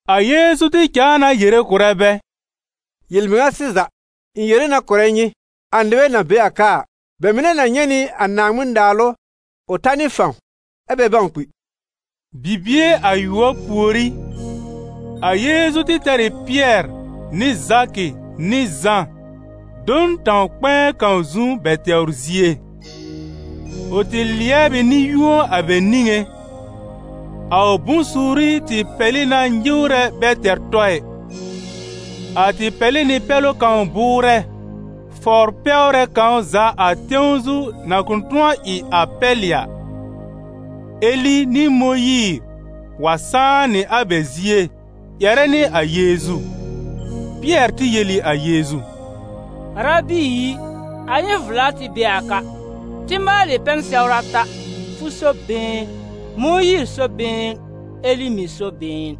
A Yeezu tɩ cãa na yere kʋ̀rɛ bɛ: «Yel-mɩŋa sɩza, ɩ̃ yere na kʋ̀rɛ nyɩ, a nɩbɛ na be a ka a, bɛ mɩnɛ na nyɛ̃ nɩ a Naaŋmɩn-Naalʋ ʋ ta nɩ fãw, ɛ́ bɛ bãw kpi.» Bibie ayʋɔb pùorí, a Yeezu tɩ tɛr ɩ Pɩɛr nɩ Zakɩ nɩ Zã do n tãw-kpɛ̃ɛ kãw zu bɛ tɛwr zie. Ʋ tɩ lɩɛb ɩ nɩ-yũo a bɛ niŋé. A ʋ bʋ̃-suuri tɩ pɛlɩ na nyɩwrɛ bɛ tɛr tɔ ɩ. A tɩ pɛlɩ nɩ pɛlʋ kãw bʋʋrɛ, fɔbr-pɛwrɛ kãw za a tẽw zu na kʋ̃ tʋ̃ɔ ɩ a pɛlɩ a ɩ. Eli nɩ Mõyiir wa sãá nɩ a bɛ zie ƴɛrɛ nɩ a Yeezu. Pɩɛr tɩ yel ɩ a Yeezu: «Arabi i, a ɩ n vla kɛ́ tɩ be a ka; tɩ maalɩ pɛn-sɛwr ata: fʋ so been, Mõyiir so been, Eli mɩ̀ so been.»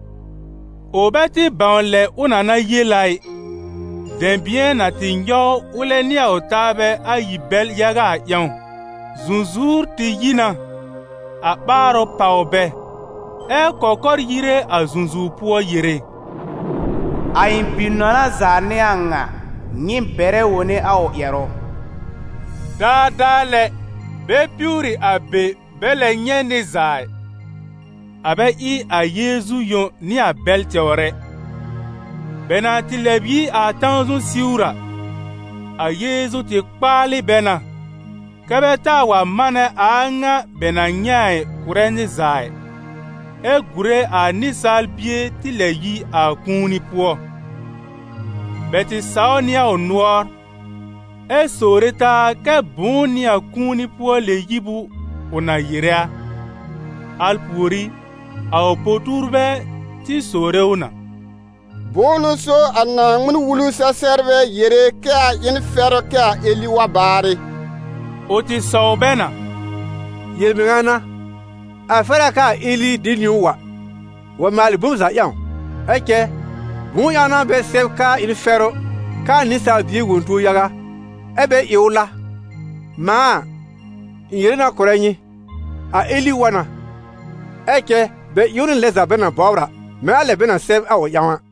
Ʋ bɛ tɩ bãw lɛ ʋ na na yel a ɩ, dɛ̃bɩ̃ɛ na tɩ nyɔw ʋlɛ nɩ a ʋ taabɛ ayi bɛl yaga a ƴãw. Zũzuwr tɩ yi na, a ɓaarʋ pàw bɛ, ɛ́ kɔkɔr yire a zũzuwr pʋɔ yere: «A ɩ̃ Bi-nɔna za n'ɩ a ŋa, nyɩ bɛrɛ wone a ʋ ƴɛrʋ.» Daadaa lɛ, bɛ piwri a be bɛ lɛ nyɛ̃ nɩr za ɩ, a bɛ ɩ a Yeezu yõ nɩ a bɛl tɛwr ɛ. Bɛ na tɩ lɛb yi a tãw zu siwr a, a Yeezu tɩ kpaalɩ bɛ na kɛ bɛ taa wa manɛ a a ŋa bɛ na nyɛ̃ a kʋ̀rɛ nɩr za ɩ, ɛ gùre a Nɩsaal Bie tɩ lɛb yi a kũuni pʋɔ. Bɛ tɩ saw nɩ a ʋ nʋɔr, ɛ sowre taa kɛ́ bʋ̃ʋ n'ɩ a kũu-pʋɔ-lɛ-yib ʋ na yere a. Al pùorí, a ʋ po-tuurbɛ tɩ sowre ʋ na: «Bʋ̃ʋ n'ʋ so a Naaŋmɩn-Wulu-sɛ-sɛbrbɛ yere kɛ a ɩ n fɛrʋ kɛ a Eli wa baarɩ?» Ʋ tɩ sɔw bɛ na: «Yel-mɩŋa n'a, a fɛr a kɛ a Eli de niwn wa, wa maalɩ bom za ƴãw; ɛ cɛ, bʋ̃ʋ ƴãw n'a bɛ sɛb kɛ a ɩ n fɛrʋ kɛ a Nɩsaal Bie wõ tuo yaga, ɛ́ bɛ ɩ ʋ la? Mãa a, ɩ̃ yere na kʋ̀rɛ nyɩ: a Eli wa na, ɛ cɛ bɛ ɩ ʋ nɩ a lɛ za bɛ na bɔbr a, mɛ̃ a lɛ bɛ na sɛb a ʋ ƴãw a.»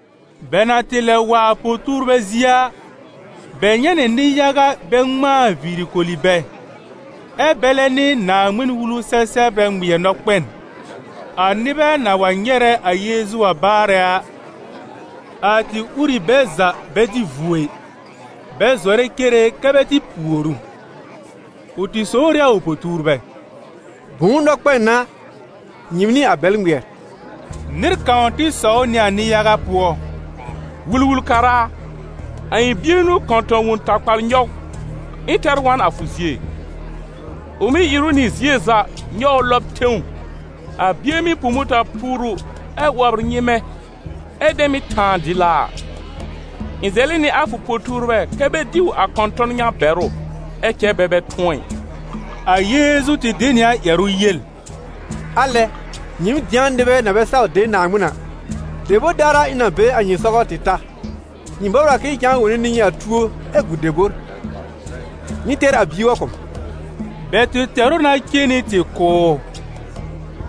Bɛ na tɩ lɛb wa a po-tuurbɛ zie a, bɛ nyɛ̃ nɩ nɩ-yaga bɛ ŋmãa viiri koli bɛ, ɛ́ bɛlɛ nɩ Naaŋmɩn-Wulu-sɛ-sɛbrbɛ ŋmɩɛr nɔkpɛn. A nɩbɛ na wa nyɛrɛ a Yeezu wa baarɛ a, a tɩ ur ɩ bɛ za bɛ dɩ vuo ɩ, bɛ zɔrɛ cere kɛ bɛ tɩ pùor ʋ. Ʋ tɩ sowr ɩ a ʋ po-tuurbɛ: «Bʋ̃ʋ nɔkpɛn n'a nyɩɩm nɩ a bɛl ŋmɩɛr?» Nɩr kãw tɩ sɔw nɩ a nɩ-yaga pʋɔ: «Wul-wul-kara a, a ɩ̃ bie n'ʋ kɔ̃tɔ̃-wõw-takpal nyɔw, ɩ̃ tɛr wa n a fʋ zie. Ʋ mɩ́ ìr ʋ nɩ zie za, nyɔw ʋ lɔb tẽw, a bie mɩ́ pu mʋta-puuru ɛ 'wɔbr nyɩ́mɛ́, ɛ dɛ mɩ́ tãa dɩlaa a. Ɩ̃ zɛlɩ nɩ a fʋ po-tuurbɛ kɛ́ bɛ diw a kɔ̃tɔ̃n ŋa bɛr ʋ, ɛ cɛ bɛ bɛ tʋ̃ɔ ɩ.» A Yeezu tɩ de nɩ a ƴɛrʋ yel: «Alɛ! Nyɩɩm dɩ̃a nɩbɛ na bɛ saw de Naaŋmɩn a! Debor daar a ɩ̃ na be a nyɩ sɔgɔ tɩ ta? Nyɩ bɔbr a k'ɩ̃ɩ cãa wõne nɩ nyɩ a tuo ɛ gu debor? Nyɩ tɛr a bie wa kʋ̀ m!» Bɛ tɩ tɛr ʋ na cen nɩ tɩ kʋ̀ ʋ.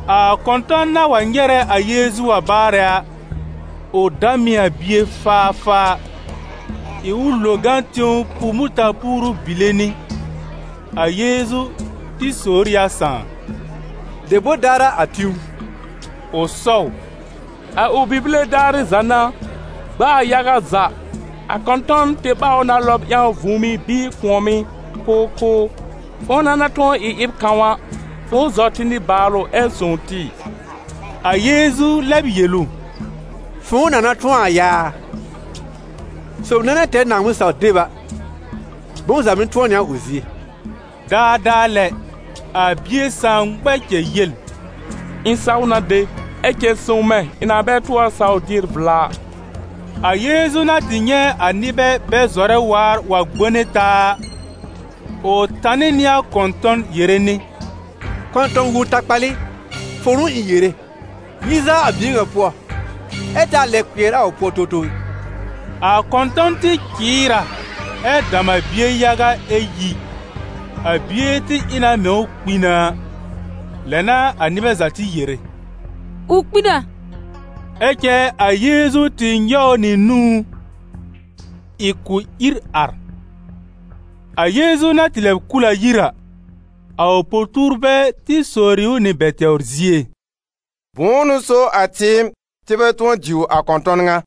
A kɔ̃tɔ̃n na wa nyɛrɛ a Yeezu wa baarɛ a, ʋ dam ɩ a bie faafaa, ɩ ʋ lo gã tẽw pu mʋta-puuru bile nɩ. A Yeezu tɩ sowr ɩ a sãà: «Debor daar a a tĩ ʋ?» Ʋ sɔw: «A ʋ bibile daarɩ za n'a. Gb'aa yaga za, a kɔ̃tɔ̃n tɩ ɓaw ʋ na lɔb ƴãw vũùmí bɩɩ kʋ̃ɔ̀mɩ́ k'ʋʋ kʋ́ ʋ. Fʋ̃ʋ na na tʋ̃ɔ ɩ ɩb kãw a, fʋ̃ʋ zɔ tɩ nɩbaalʋ ɛ sõw tɩ!» A Yeezu lɛb yel ʋ: «Fʋ̃ʋ na na tʋ̃ɔ a yaa? Sob nɛ na tɛr Naaŋmɩn-saw-deb a, bom za mɩ́ tʋ̃ɔ nɩ a ʋ zie.» Daadaa lɛ, a bie sãà ŋmɛ cɛl yel: «Ɩ̃ saw na de! Ɛ cɛ sõw mɛ̃ ɩ̃ na bɛ tʋɔr saw dier vla a!» A Yeezu na tɩ nyɛ̃ a nɩbɛ bɛ zɔrɛ waar wa gbone taa a, ʋ tanɩ nɩ a kɔ̃tɔ̃n yere nɩ: «Kɔ̃tɔ̃-wõw-takpal ɩ, fʋ̃ʋ n'ʋ ɩ̃ yere: yi zaa a bie ŋa pʋɔ, ɛ taa lɛb kpɩɛr ʋ pʋɔ towtow ɛ!» A kɔ̃tɔ̃n tɩ cɩɩr a, ɛ dam a bie yaga ɛ yi. A bie tɩ ɩ na mɛ̃ ʋ kpi na a, lɛ n'a a nɩbɛ za tɩ yere: «Ʋ kpi na!» Ɛ cɛ a Yeezu tɩ nyɔw ʋ nɩ nũú, ɩ k'ʋ ìr ar. A Yeezu na tɩ lɛb kul a yir a, a ʋ po-tuurbɛ tɩ sowri ʋ nɩ bɛ tɛwr zie: «Bʋ̃ʋ n'ʋ so a tɩɩm, tɩ bɛ tʋ̃ɔ diw a kɔ̃tɔ̃n ŋa?»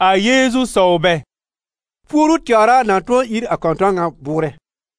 A Yeezu sɔw bɛ: «Puoru tɛwr a na tʋ̃ɔ ír a kɔ̃tɔ̃n ŋa bʋʋrɛ.»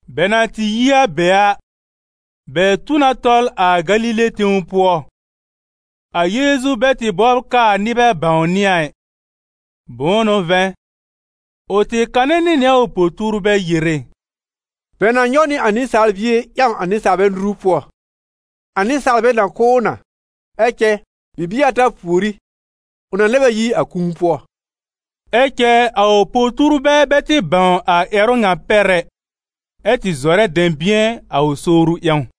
Bɛ na tɩ yi a be a, bɛ tu na tɔl a Galile tẽw pʋɔ. A Yeezu bɛ tɩ bɔbr k'aa nɩbɛ bãwnɩ a ɩ. Bʋ̃ʋ n'ʋ vɛ̃, ʋ tɩ kanɛ nɩ nɩ a ʋ po-tuurbɛ yere: «Bɛ na nyɔw nɩ a Nɩsaal Bie ƴãw a nɩsaalbɛ nuru pʋɔ, a nɩsaalbɛ na kʋ́ ʋ na, ɛ cɛ bibie ata pùorí, ʋ na lɛb a yi a kũu pʋɔ.» Ɛ cɛ a ʋ po-tuurbɛ bɛ tɩ bãw a ƴɛrʋ ŋa pɛr ɛ, ɛ tɩ zɔrɛ dɛ̃bɩ̃ɛ a ʋ sowru ƴãw.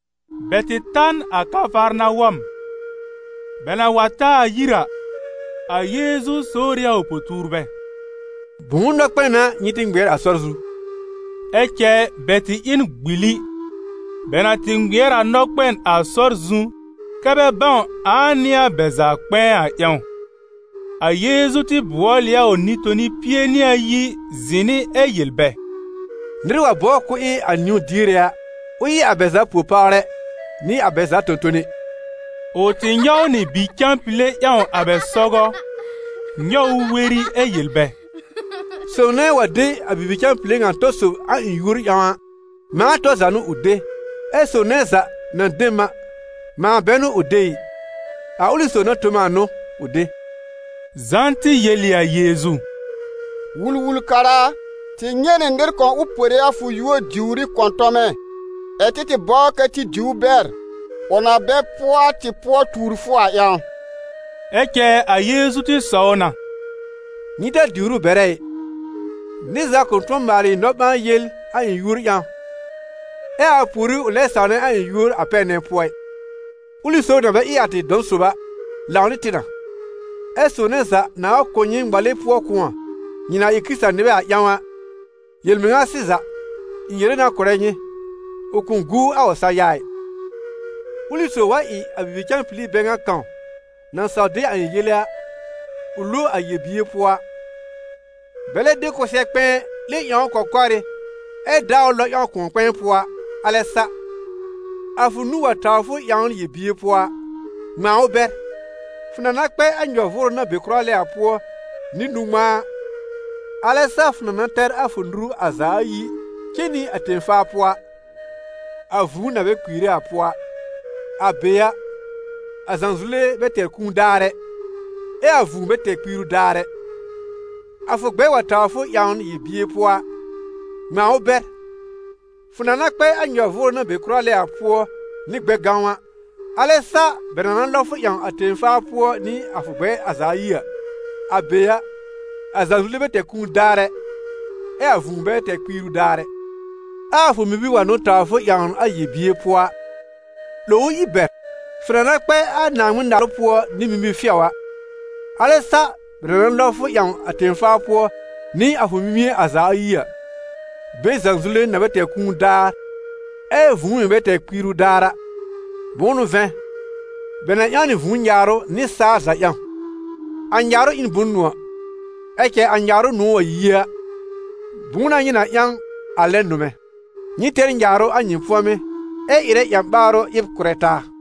Bɛ tɩ ta n a Kafarnawɔm. Bɛ na wa ta a yir a, a Yeezu sowr ɩ a ʋ po-tuurbɛ: «Bʋ̃ʋ nɔkpɛn n'a nyɩ tɩ ŋmɩɛr a sɔr zu?» Ɛ cɛ bɛ tɩ ɩ n gbili, bɛ na tɩ ŋmɩɛr a nɔkpɛn a sɔr zu kɛ́ bɛ bãw ãa n'ɩ a bɛ za kpɛ̃ɛ a ƴãw. A Yeezu tɩ bʋɔl ɩ a ʋ Nɩ-toni pie nɩ ayi zɩ̃ nɩ ɛ yel bɛ: «Nɩr wa bɔbr k'ʋʋ ɩ a niwn-diere a, ʋ ɩ a bɛ za po-pawrɛ nɩ a bɛ za tõ-tone.» Ʋ tɩ nyɔw nɩ bi-cãpile ƴãw a bɛ sɔgɔ, nyɔw ʋ weri ɛ yel bɛ: «Sob nɛ wa de a bibi-cãpile ŋa tɔ sob a ɩ̃ yúor ƴãw a, mãa tɔr za n'ʋ ʋ de, ɛ sob nɛ za na de m a, mãa bɛ n'ʋ ʋ de ɩ, a ʋlɩ sob na tõ m a n'ʋ ʋ de.» Zã tɩ yel ɩ a Yeezu: «Wul-wul-kara a, tɩ nyɛ̃ nɩ nɩr kãw ʋ pore a fʋ yúor diwr ɩ kɔ̃tɔmɛ, ɛ̀ tɩ tɩ bɔbr kɛ tɩ diw ʋ bɛr, ʋ na bɛ pʋɔ a tɩ pʋɔ tuur fʋ a ƴãw.» Ɛ cɛ a Yeezu tɩ sɔw na: «Nyɩ ta diwr ʋ bɛrɛ ɩ, nɩr za kʋ̃ tʋ̃ɔ maalɩ nɔ-ɓãa-yel a ɩ̃ yúor ƴãw, ɛ a pùorí ʋ lɛb sãwnɛ a ɩ̃ yúor a pɛr nɛ pʋɔ ɩ. Ʋlɩ sob na bɛ ɩ a tɩ dɔ̃ sob a, lãw nɩ tɩ na. Ɛ sob nɛ za nãà wa kʋ̀ nyɩ ŋmale pʋɔ kʋ̃ɔ, nyɩ na ɩ Kɩrɩta-nɩbɛ a ƴãw a, yel-mɩŋa sɩza, ɩ̃ yere na kʋ̀rɛ nyɩ, ʋ kʋ̃ guu a ʋ sã-ya ɩ.» «Ʋlɩ sob wa ɩ a bibi-cãpili bɛ ŋa kãw, na saw de a ɩ̃ yele a, ʋ lo a yel-bier pʋɔ a, bɛlɛ de kʋsɛ-kpɛ̃ɛ 'lẽ ƴãw ʋ kɔkɔrɩ́ ɛ daa ʋ lɔb ƴãw kʋ̃ɔ-kpɛ̃ɛ pʋɔ a, alɛ sa. A fʋ nũu wa tawr fʋ ƴãwn yel-bier pʋɔ a, ŋmãa ʋ bɛr; fʋ na na kpɛ a nyɔ-vʋʋrʋ na be kʋra lɛ a pʋɔ nɩ a nũ-ŋmãa a, alɛ sa fʋ na na tɛr a fʋ nuru a za ayi cen nɩ a tẽ-faa pʋɔ a, a vũu na bɛ kpiire a pʋɔ a. [ A be a, a zãzule bɛ tɛr kũu daar ɛ, ɛ a vũu bɛ tɛr kpiiru daar ɛ.] A fʋ gbɛr wa tawr fʋ ƴãwn yel-bier pʋɔ a, ŋmãa ʋ bɛr; fʋ na na kpɛ a nyɔ-vʋʋrʋ na be kʋra lɛ a pʋɔ nɩ a gbɛ-gãw a, alɛ sa bɛ na na lɔb fʋ ƴãw a tẽ-faa pʋɔ nɩ a fʋ gbɛ̃ɛ a za ayi a. [ A be a, a zãzule bɛ tɛr kũu daar ɛ, ɛ a vũu bɛ tɛr kpiiru daar ɛ.] Ɛ a fʋ mimir wa n'ʋ tawr fʋ ƴãwn a yel-bier pʋɔ a, 'lòw ʋ ír bɛr; fʋ na na kpɛ a Naaŋmɩn-Naalʋ pʋɔ nɩ mimi-fɩɔ a, alɛ sa bɛ na na lɔb fʋ ƴãw a tẽ-faa pʋɔ nɩ a fʋ mimie a za ayi a, be zãzule na bɛ tɛr kũu daar, ɛ vũu mɩ̀ bɛ tɛr kpiiru daar a. Bʋ̃ʋ n'ʋ vɛ̃, bɛ na ƴãw nɩ vũu nyaarʋ nɩsaal za ƴãw. A nyaarʋ ɩ n bʋ̃-nʋ̃ɔ̀; ɛ cɛ a nyaarʋ nʋ̃ɔ̀ wa yi a, bʋ̃ʋ n'a nyɩ na ƴãw a lɛb nʋmɛ̃? Nyɩ tɛr nyaarʋ a nyɩ pʋ̃ɔmɩ́, ɛ ɩrɛ ƴã-ɓaarʋ ɩb kʋ̀rɛ taa.»